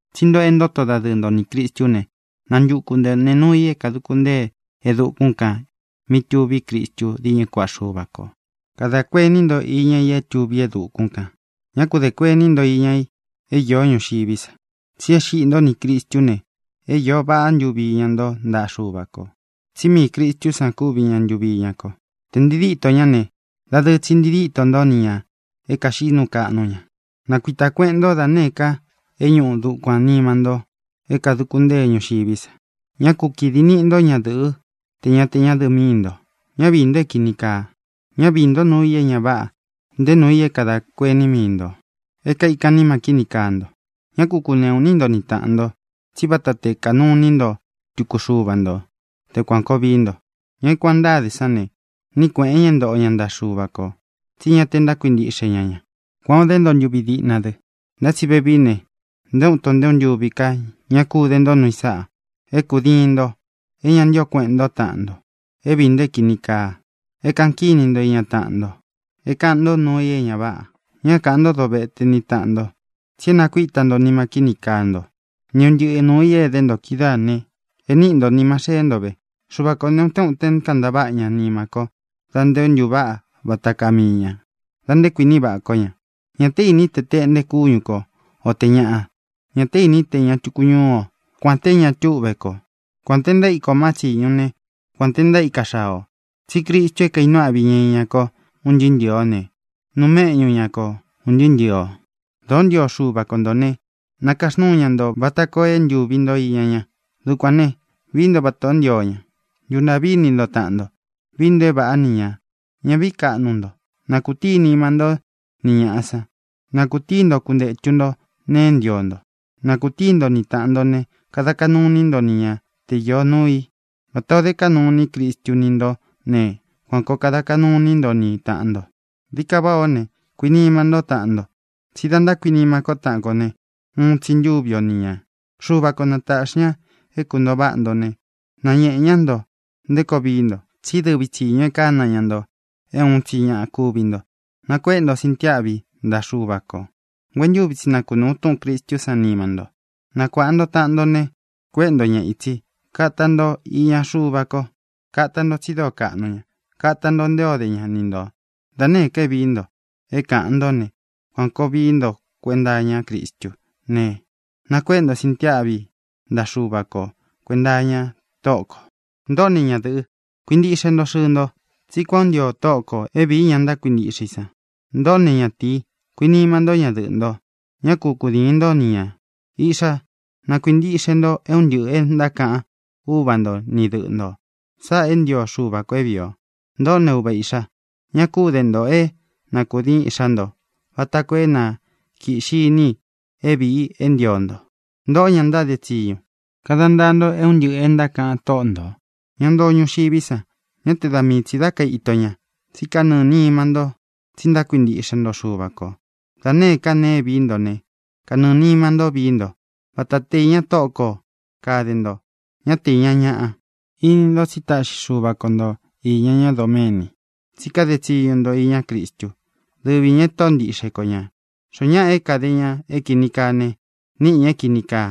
Tsí ntoꞌo é ntoto dadɨɨ nto nī Cristú ne, nantuku nto nēe nuu i é kāduku ntée e dukún kān mí tuví Cristu díñɨ kuaꞌa Xuva kō. Kadā kuení nto iña i é tuví e dukún kān; ñá ku dē kuení nto iña i é īó ñuxiví sa. Tsi é xiꞌi ntó nī Cristú ne, é iō vaꞌá ntuvi iña nto ntaꞌa Xúva kō. Tsí miī Cristu san kúvi ña ntūvi iña ko. Tē ntii dítō ñá ne, dadɨɨ tsi ntii dítō ntó ni ñā é kāxiꞌí nuu kaꞌnu ña. Nakuītá kueꞌen nto da nēé ka e ñuꞌu dukuān nima nto é kāduku ntée ñuxiví sa. Ñá ku kīdi niꞌi nto ñádɨ̄ꞌɨ́ tē ñá tē ñádɨ̄ꞌɨ míi nto. Ñá viī nto é kīni kaa. Ñá viī ntó nuu i é ña váꞌa, nté nuu i é kadā kuení mii ntō é kaikan nima kíni kaa nto. Ñá ku kūneꞌu iní nto ni tāꞌan nto, tsí vata te kanuu iní nto tuku xuva nto te kuān koo vií nto. Ña é kuān ó ntáde sán ne, níꞌi kuēꞌen ña é ntoꞌo ña ntaꞌa Xuva kō, tsí ña te ntákuintiꞌxe ña ña. Kuān o dé nto ntuvi diꞌna dɨ. Ntá tsi vevií ne, nté uun ito nté uun ntuvi ká ña kú de nto nuu i sáꞌā: é kūdiin nto, é ña ntío kuēꞌen ntó taꞌan nto, é viī nto é kīni kaa, é kāꞌan kíni nto iña taꞌan nto, é kāꞌan nto nuu i é ña váꞌa. Ñá kaꞌān ntó dovete ni tāꞌan nto, tsi é nakuíta nto nima kíni kaa nto ni un ntɨꞌɨ nūu i é edé nto kídaā ne, e níꞌi nto nīma xeé nto ve. Xuva kō ne, utén uten kantaváꞌa ña nima ko da nté ntuváꞌa vata kaa mii ñā, da nté kuīní vaꞌa kó ña. Ñā té īní tē ña Israeé o, o te tuku ñaꞌa ō. Ñā té īní te tēꞌnte kúñu ko, o tē ñaꞌa. Ñā té īní tē ña tuku ñuú o, kuān té ña túꞌve ko, kuān te ntaíka ō má tsiñu ne, kuān te ntaíka xaa ō, tsí Cristu é kaīnuu áꞌvi ña iña ko un ntɨɨ́ ntɨɨ̄ ó ne, nuu méꞌñu ña ko ūn ntɨɨ́ ntɨɨ̄ o. Dōó ntio Xuva ko ntō né, nākaxnúu ña nto vata koo é ntūvi nto iña ña. Dukuān ne, vií nto vatā ó ntio ña: ntuntāꞌví ini nto taꞌan nto; vií nto é vāꞌá ni ñā; ñá vīí kaꞌnu nto; na kūtíi nima ntó ni ñāꞌa san; na kūtíi nto kuntētu nto nee é ntio nto. Na kūtíi nto ni tāꞌan nto ne, kada kaꞌnu iní nto ni ña te īó nuu i. Vata ō dé kaꞌnu iní Cristu ni ntó ne, kuan kōo kada kaꞌnu iní nto ni tāꞌan nto. Dií ka váꞌā ó ne, kuinima ntó taꞌan nto, tsí da ntákuinima kó taꞌan ko ne, uun tsi ntúvi o ni ñā. Xuva ko na tāꞌxi ña é kuntōo váꞌa nto ne, nañēꞌe ñá nto nté koo vií nto, tsí dɨvi tsīñu e kána ña nto é uun tsi ñaꞌa kúvi nto. Nakuéꞌe nto sintiáꞌvi ntaꞌa Xuva kō. Nguentúvi tsi na kunūu túꞌūn Cristú san nima nto. Nakuāꞌa nto taꞌan nto ne, kuéꞌe nto ña ītsi. Kata nto iña Xuva ko. Kata nto tsi dóo kaꞌnu ña. Kata nto nté ō dé ña ni ntō. Da nēé ka é viī ntó, é kāꞌan ntó ne, kuān koo vií nto kuenta iña Cristú ne, nakuéꞌe nto sintiáꞌvi ntaꞌa Xuva ko kuēnta iña Tóꞌo kō. Ntōꞌó ne, ñadɨ̄ꞌɨ, kuintiꞌxe nto xɨɨ nto, tsí kuān ó ntio Tóꞌo kō é vīí ña ntákuintiꞌxe i san. Ntōꞌó ne, ñatīi, kuinima ntó ñadɨꞌɨ̄ nto. Ñá ku kudīin ntó ni ñā. Īꞌxá, na kuīntiꞌxe nto é un ntɨꞌɨ̄ e ntákaꞌan úva nto ni dɨꞌɨ ntō. Sáꞌā é ntio Xuva kō é vīi o. Ntōꞌó ne, uva īꞌxá, ña kú de nto é na kūdiin iꞌxá nto vata koo é na kīꞌxi iní i é viī i é ntio nto. Ntōꞌó, ña ntáde tsiñu, kada ntaa nto é un ntɨꞌɨ̄ e ntákaꞌan tóꞌo ntō, ña ntoo ñuxiví sa, ñá te da mii tsī dá kaito ñā, tsí kanɨɨ̄ nima ntó, tsi ntákuintiꞌxe nto Xuva kō. Da nēé ka nee é viī ntó ne, kanɨɨ̄ nima ntó vií nto, vata te īña Tóꞌo ko kāde nto, ñá te īña ñaꞌa. Ini ntó tsi táꞌxi Xuva ko nto īña ñá doméni, tsí kade tsiñu nto iñá Cristu, dɨvi ñā e Tóꞌo ntiꞌxe ko ñā. Xoó ñaꞌa é kāde ña é kīni kaa ne, níꞌi ñā é kīni kaa,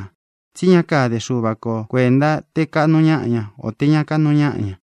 tsí ña káde Xuva ko kuēnta te kaꞌnu ñáꞌa ña, o tē ña kaꞌnu ñáꞌa ña.